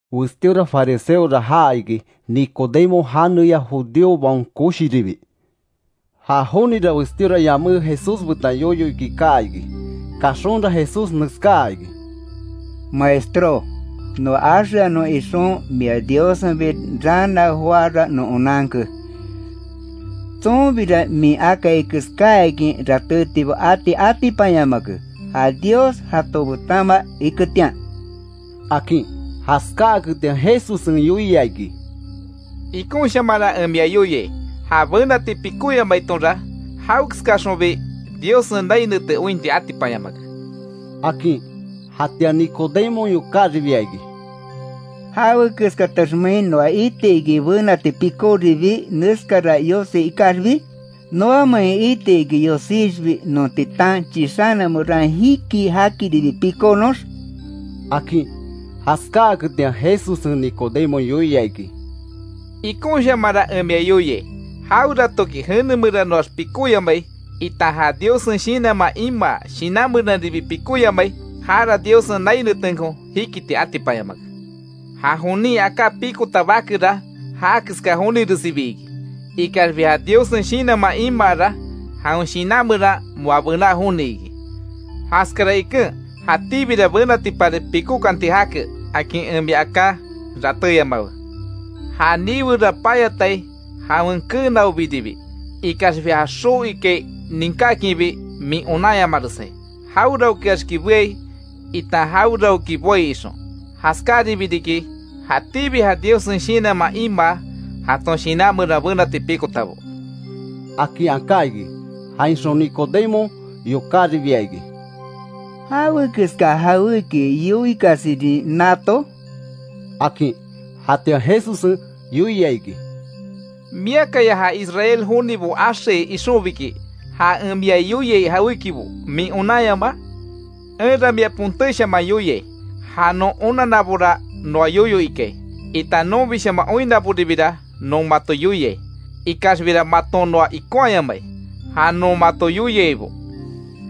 Westíora fariseora jaa iki, Nicodemo janeya judíobaon koshiribi. Ja jonira westíora yamé Jesús betan yoyo iki kaa iki. Kaxonra Jesús neskaa iki: —Maestró, noa axeanon ixon mia Diossenbi raana joára non onanke; tsonbira min akai keskáakin ratétibo ati atipanyamake, ja Dios jato betanma iketian —akin. Jaskáaketian Jesussen yoia iki: —Ikonshamanra en mia yoiai, ja benati pikóyamaitonra, jawekeskaxonbi Diossen nai nete ointi atipanyamake —akin. Jatian Nicodemon yokáribia iki: —¿Jawekeskataxmein noa iti iki benati pikoribii neskara yosi ikaxbi? ¿Noamein iti iki yosixbi non titan chixana meran jikii, jakiribi pikonox? —akin. Jaskáaketian Jesussen Nicodemo yoia iki: —Ikonshamanra en mia yoiai, jaweratoki jene meranoax pikóyamai, itan ja Diossen Shinanman imaa shinan meranribi pikóyamai, jara Diossen nai netenko jikiti atipanyamake. Ja jonin aká pikota bakera ja keska joniressibi iki. Ikaxbi ja Diossen Shinanman imaara, jawen shinan meran moa bená joni iki. Jaskara iken: ‘Jatíbira benatipari pikókanti jake’, akin en mia aká ratéyamawe. Ja niwera payatai jawen kenaobiribi, ikaxbi ja xoo ikai ninkákinbi min onanyamaresai; jaweraokeaxki beai itan jaweraoki boai ixon. Jaskararibi riki jatíbi ja Diossen shinanman, imaa jaton shinan meran benati pikotabo —akin aká iki. Jainxon Nicodemon yokáribia iki: —¿Jawekeska jawéki yoikasirin nato? —akin. Jatian Jesussen yoia iki: —¿Miakaya ja Israel jonibo axeai ixonbiki, ja en mia yoiai jawékibo min onanyamaa? Enra mia pontéshaman yoiai; ja non onannabora noa yoyo ikai itan nonbishaman oinnaboribira non mato yoiai. Ikaxbira maton noa ikonhayamai ja non mato yoiaibo.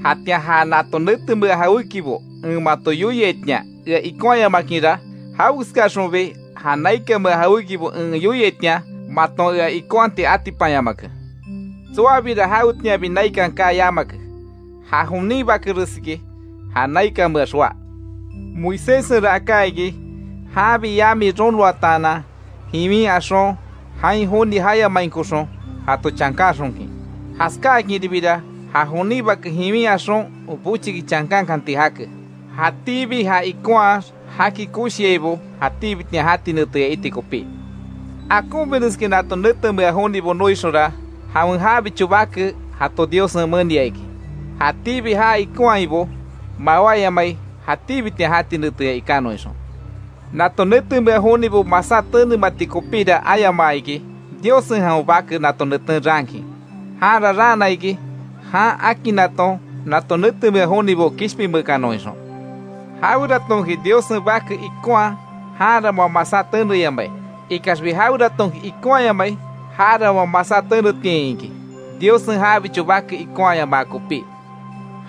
Jatian ja nato netemea jawékibo en mato yoiaitian ea ikonhayamakinra, jawekeskaxonbi ja naikanmea jawékibo en yoiaitian maton ea ikonhati atipanyamake. Tsoabira jawetianbi naikan kaa yamake, ja jonin Bakeresiki ja naikanmeax joá. Moiséssenra aká iki, janbi yami ronoataanan jiwin axon, jain joni jayamainkoxon jato chankanxonkin, jaskáakinribira ja jonin Bake jiwin axon bochiki chankankanti jake. Jatíbi ja ikonhax jaki koshiaibo, jatíbitian jati neteya iti kopi. Akonbireskin nato netemea jonibo noixonra, jawen jabicho bake jato Diossen menia iki, jatíbi já ikonhaibo, mawáyamai jatíbitian jati neteya ikanon ixon. Nato netemea jonibo masá tenemati kopíra ayamaa iki, Diossen jawen bake nato neten raankin. Janra raana iki, jan akinnaton nato netemea jonibo kishpinmeekanon ixon. Jaweratonki Diossen Bake ikonhaa, janra moa masá teneyamai. Ikaxbi jaweratonki ikonhayamai, jara moa masá tenetiain iki; Diossen jabicho Bake ikonhayamaa kopí.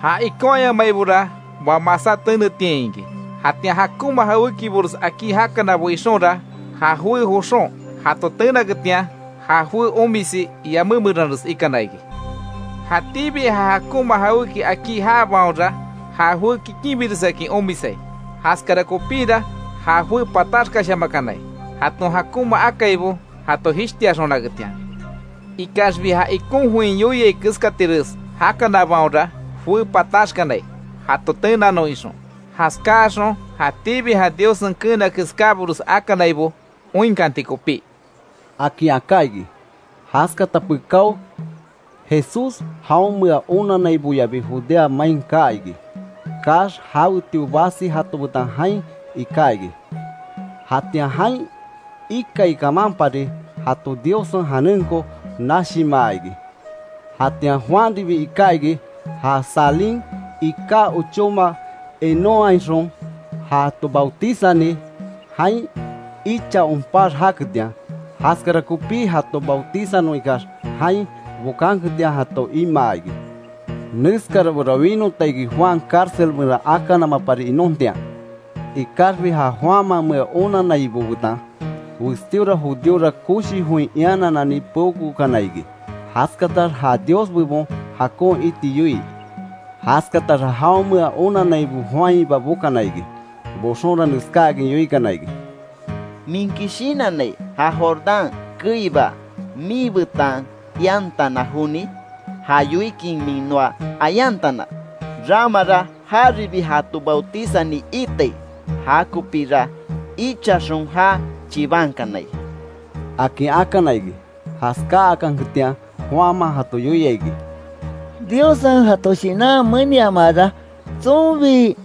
Ja ikonhayamaibora moa masá tenetiain iki; jatian jakonma jawékibores akí jakanabo ixonra, ja joé joxon jato tenaketian, ja joé omisi yamé meranres ikana iki. Jatíbi ja jakonma jawéki akí jaabaonra, ja joé kikinbiresakin omisai, jaskara kopíra ja joé pataxkashamakanai, jaton jakonma akaibo jato jishtiaxonaketian. Ikaxbi, ja ikon join yoiai keskatires jakanabaonra, joé pataxkanai jato tenanon ixon, jaskáaxon jatíbi ja Diossen keena keskábores akanaibo oinkanti kopí —akin aká iki. Jaskata pekáo Jesús jaonmea onannaiboyabi Judea main kaa iki; kaax jawetio basi jato betan jain iká iki. Jatian jain ikai kamanpari jato Diossen janenko nashimaa iki. Jatian Juanribi iká iki, ja Salim iká ochóma Enónhainxon jato bautizani, jain icha onpax jaketian. Jaskara kopí jato bautizanon ikax jain bokanketian, jato imaa iki. Neskarabora winota iki Juan cárcel meran akanamapari inontian. Ikaxbi ja Juanmamea onannaibo betan, westíora judíora, koshi join iananani peokookana iki, jaskatax ja Dios bebon jakon iti yoii. Jaskataxa jaonmea onannaibo Juanhiba bokana iki, boxonra neskáakin yoikana iki: —¿Minki shinannai ja Jordán keiba miibetan iantana joni? Ja yoikin min noa ayantana, ramara jaribi jato bautizani iitai, jakopíra ichaxon já chibankanai —akin akana iki. Jaskáakanketian Juanman jato yoia iki: —Diossen jato shinan meniamaara, tsonbi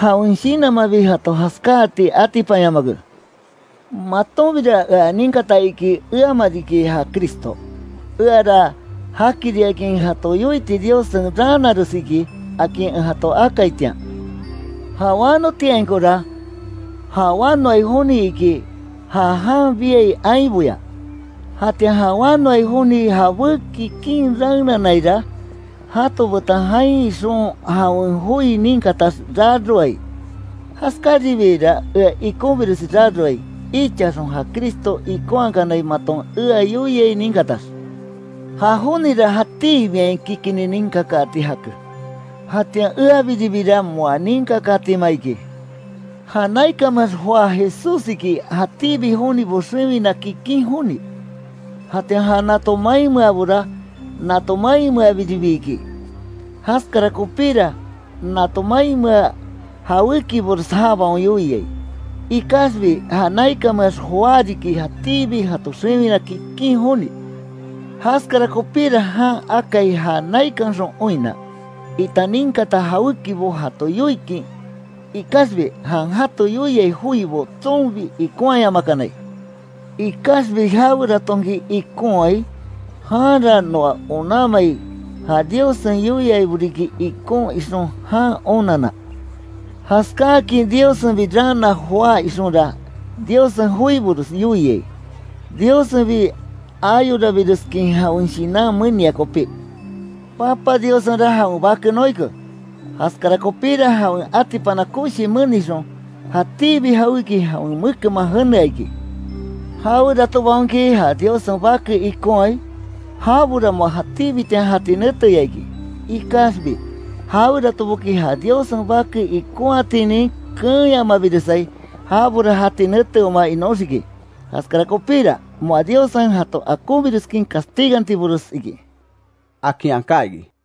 jawen shinanmanbi jato jaskáati atipanyamake. Matonbira ea ninkata iki eama riki ja Cristo, eara jakiriakin jato yoiti Diossen raanares iki, akin en jato akaitian. Ja wanotiainkora, ja wanoai joni iki ja jan biai ainboya, jatian ja wanoai joni jabé kikin raenanaira, jato betan jain ixon jawen joi ninkatax raroai; Jaskaribiira ea ikonbiresi raroai, ichaxon ja Cristo ikonhakanai maton ea yoiai ninkatax. Ja jonira jatíbiain kikinni ninkakaati jake, jatian eabiribira moa ninkakatima iki. Ja naikanmeax joá Jesussiki jatíbi jonibo xewina kikin joni. Jatian ja nato mainmeabora nato mainmea biribi iki, jaskara kopíra nato mainmea jawékibores jabaon yoiai. Ikaxbi ja naikanmeax joá riki jatíbi jato xewina kikin joni. Jaskara kopíra jan akai ja naikanxon oinna, itan ninkata jawékibo jato yoikin, ikaxbi jan jato yoiai joibo, tsonbi ikonhayamakanai. Ikaxbi jaweratonki ikonhaai, janra noa onanmai ja Diossen yoiaibo riki ikon ixon jan onanna. Jaskáakin Diossenbi raana joá ixonra, Diossen joibores yoiai, Diossenbi ayorabireskin jawen shinan menia kopí. Papa Diossenra jawen bake noike, jaskara kopíra jawen atipana koshi menixon, jatíbi jawéki jawen mekenman jenea iki. Jaweratobaonki ja Diossen Bake ikonhaai, jabora moa jatíbitian jati neteya iki. Ikaxbi, jaweratoboki ja Diossen Bake ikonhatinin keenyamabiresai, jabora jati neteoma inóxiki, jaskara kopíra moa Diossen jato akonbireskin castigantiresbo iki —akin aká iki.